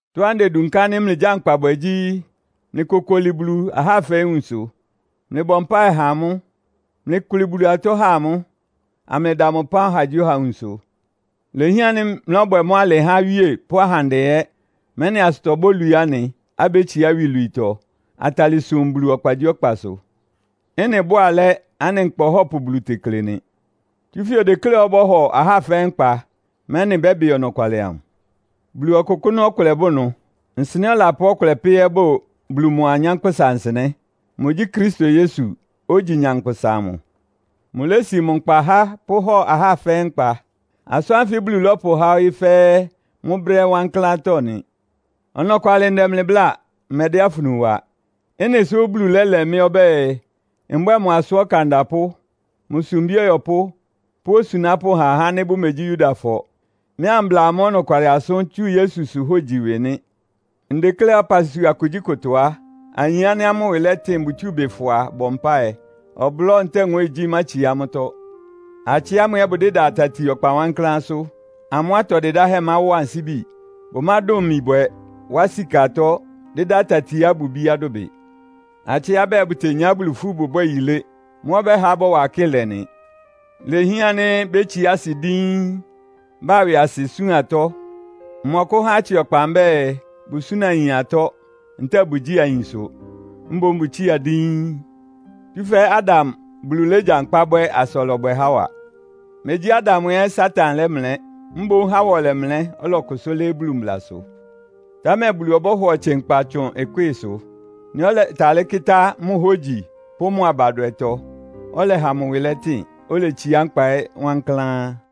Ɩtɔ́á ndedunká ánɩ́ mlɩgyánkpa bwɛ gyí, mlɩkokoli Bulu ahá fɛ́ɛ́ nwunsʋ, amlɩbɔ mpáɩ ha amʋ́. Mlɩkʋlɩ Bulu atɔ́ há amʋ́, amlɩda mʋ ɩpán ɔhagyíɔha nwunsʋ. Ilehián ánɩ́ mlɔ́bwɛ mʋ́ alɩ há awíe pʋ́ ahandɛ ɛ́, mɛ́nɩ asʋtɔ bólwií anɩ, abétsiá iwilwiitɔ, atalɩ sum Bulu ɔkpagyíɔkpasʋ. Ɩ́nɩ bʋ́ʋ alɛ́, anɩ Nkpa Ɔhɔ́pʋ Bulu tekle nɩ. Tsúfɛ́ odekléá ɔbɔ́hɔ ahá fɛ́ɛ́ nkpa, mɛ́nɩ bɛ́bɩ ɔnɔkwalɩ amʋ. Bulu ɔkʋkʋ́nʋ́ ɔkʋlɛ bʋ ɩnʋ. Nsɩnɛ́ ɔlapʋ́ ɔkʋlɛ pɛ́ ɛ́ bʋ Bulu mʋa anyánkpʋ́sa nsɩnɛ́. Mʋgyí Kristo Yesu, ogyi nyankpʋsa amʋ. Mʋlési mʋ nkpa há pʋ́hɔ ahá fɛ́ɛ́ nkpa. Asʋ́n ánfɩ Bulu lɔ́pʋhá ɔyɩ́ fɛ́ɛ́ mʋ́ brɛ́ wankláántɔ́ nɩ. Ɔnɔkwalɩ ndɛ mlɩ bláa, mmɛdɛ́ afunu wa. Ɩ́nɩ sʋ́ Bulu lɛ́lɛ mɩ́ ɔbɛ́ɛ, mbwɛ́ɛ mʋ asʋ́n ɔkan ɔdapʋ́, mʋ sumbí ɔyɔpʋ́ pʋ́ osunápʋ́ ha ahá ánɩ́ bʋmegyi Yudafɔ, mɩ́ ambla amʋ́ ɔnɔkwalɩ asʋ́n tsú Yesusʋ hógyi ɩwɩ nɩ́. Ndekléá ɔpasua kugyíkʋtɔ á, ayin ánɩ́ amʋ́ ɩwɩ lɛtɩn bʋtsúu ɩbɩ fʋa bɔ mpáɩ. Ɔblɔ́ ntɛ́ɛ nwɛ́ɛngyí mátsiá amʋ́tɔ́. Atsɩ ámʋ ɛ́ bʋdɩ́da tati ɔkpa wankláánsʋ́. Amʋ́ atɔ dɩdáhɛ́ máwɔ ansíbi. Bʋmádʋn imi bwɛ, wá sika atɔ́, dɩ́dá atatiá ɩbʋ ibíá dʋbɩ. Atsɩá bɛɛ bʋtenyá Bulu ifú bʋbwɛ́ɛ yilé. Mʋ́ ɔbɛ́ha bɔ́wa akɩ́lɛ nɩ. Ilehián ánɩ́ bétsiá asɩ díín, ba ɩwɩasɩ súan atɔ́. Mmɔkʋ́há atsɩ ɔkpa mbɛ́ɛ, bʋsúna ayin atɔ́, ntɛ́ɛ bʋgyíi ayinsʋ. Mboún bʋtsía díín. Tsúfɛ́ Adam Bulu légyankpá bwɛ́ asa ɔlɔbwɛ Hawa. Megyí Adam ɛ́ Satan lɛ́mlɛ́, mboún Hawa ɔlɛmlɛ́, ɔlɔkʋsʋ́ lɩ́ɩ́ Bulu mblasʋ. Támɛ Bulu ɔbɔ́hɔ ɔtsɩ nkpa tsʋn ɩkwɩ́ɩsʋ. Nɩ́ ɔlɛtalɩ́ kɩ́tá mʋ hógyi pʋ́ mʋ abadwɛtɔ, ɔlɛha mʋ ɩwɩ lɛtɩn, oletsiá nkpa ɛ́ wankláán.